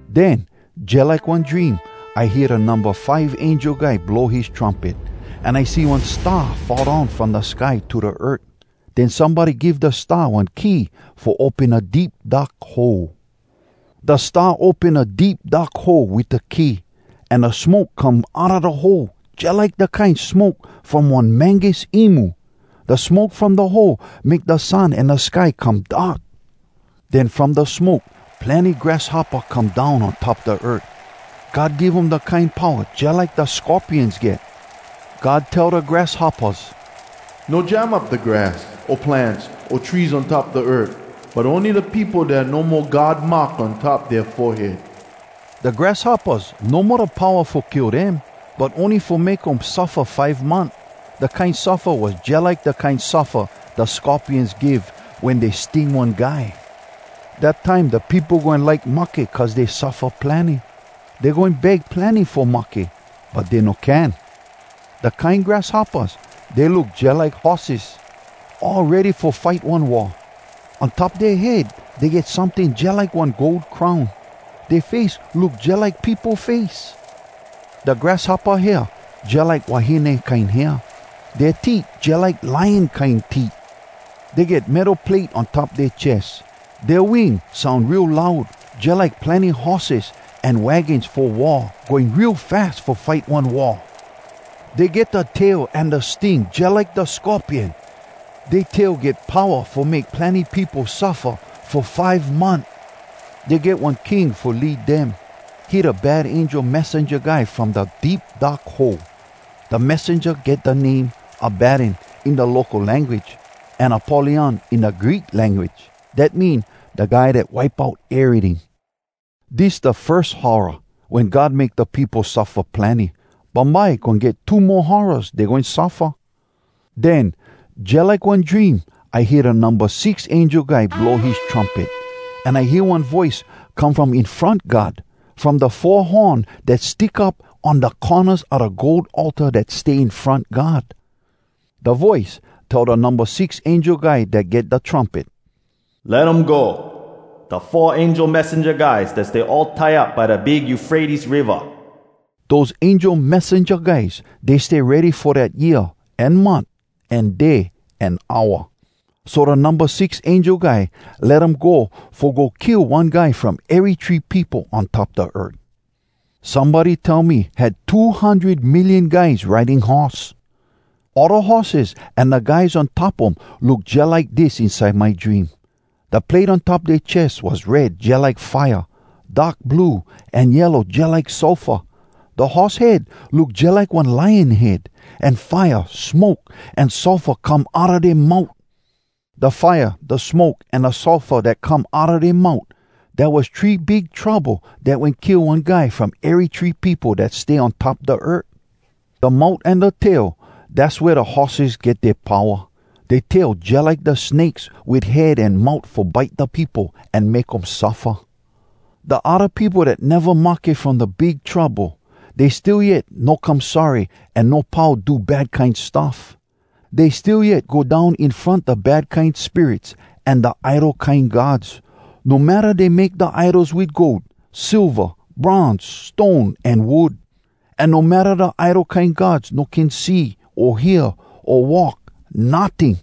Den, jalike one dream, I hear da numba five angel guy blow his trumpet, an I see one star fall down from da sky to da earth. Den somebody give da star one key fo open da Deep Dark Hole. Da star open da Deep Dark Hole wit da key, an da smoke come outa da hole, jalike da kine smoke from one mangus imu. Da smoke from da hole make da sun an da sky come dark. Den from da smoke, plenny grasshoppa come down on top da earth. God give um da kine powa jalike da scorpions get. God tell da grasshoppas, “No jam up da grass, o plants, o trees on top da earth, but ony da peopo dat no mo God mark on top dea forehead!” Da grasshoppas no mo da powa fo kill dem, but ony fo make um suffa five month. Da kine suffa was jalike da kine suffa da scorpions give wen dey sting one guy. Dat time da peopo goin like mahke cuz dey suffa plenny. Dey goin beg plenny fo mahke, but dey no can! Da kine grasshoppas, dey look jalike horses, all ready fo fight one war. On top dea head dey get someting jalike one gold crown. Dea face look jalike peopo face. Da grasshoppa hair, jalike wahine kine hair. Dea teet, jalike lion kine teet. Dey get metal plate on top dea ches. Dea wing soun real loud, jalike plenny horses an wagons fo war going real fas fo fight one war. Dey get da tail an da sting jalike da scorpion. Dea tail get powa fo make plenny peopo suffa fo five month. Dey get one king fo lead dem. He da bad angel messenja guy from da Deep Dark Hole. Da messenja get da name “Abaddon” in da local language, an “Apollyon” in da Greek language. Dat mean, “Da Guy dat Wipe Out Eryting.” Dis da firs horra, wen God make da peopo suffa plenny. Bumbye goin get two mo horraz dey goin suffa. Den, jalike one dream, I hear da numba six angel guy blow his trumpet. An I hear one voice come from in front God, from da four horn dat stick up on da cornas a da gold altar dat stay in front God. Da voice tell da numba six angel guy dat get da trumpet, “Let um go, da four angel messenja guys dat stay all tie up by da big Eufrates Riva!” Dose angel messenja guys, dey stay ready fo dat year, an month, an day, an hour. So da numba six angel guy let um go fo go kill one guy from ery three peopo on top da earth. Somebody tell me had two hundred million guys riding horse. All da horses an da guys on top um look jalike dis inside my dream: da plate on top dea ches was red jalike fire, dark blue, an yellow jalike sulfur. Da horse head look jalike one lion head. An fire, smoke, an sulfur come outa dea mout. Da fire, da smoke, an da sulfur dat come outa dea mout, dat was three big trouble dat wen kill one guy from ery three peopo dat stay on top da earth. Da mout an da tail, dass wea da horses get dea powa. Dea tail jalike da snakes wit head an mout fo bite da peopo, an make um suffa. Da odda peopo dat neva mahke from da big trouble, dey still yet no come sorry an no pau do bad kine stuff. Dey still yet go down in front da bad kine spirits an da idol kine gods. No matta dey make da idols wit gold, silva, bronze, stone, an wood. An no matta da idol kine gods no can see, o hear, o walk, notting!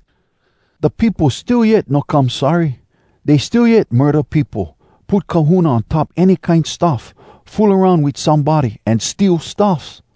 Da peopo still yet no come sorry. Dey still yet murda peopo, put kahuna on top any kine stuff, fool aroun wit somebody, an steal stuffs.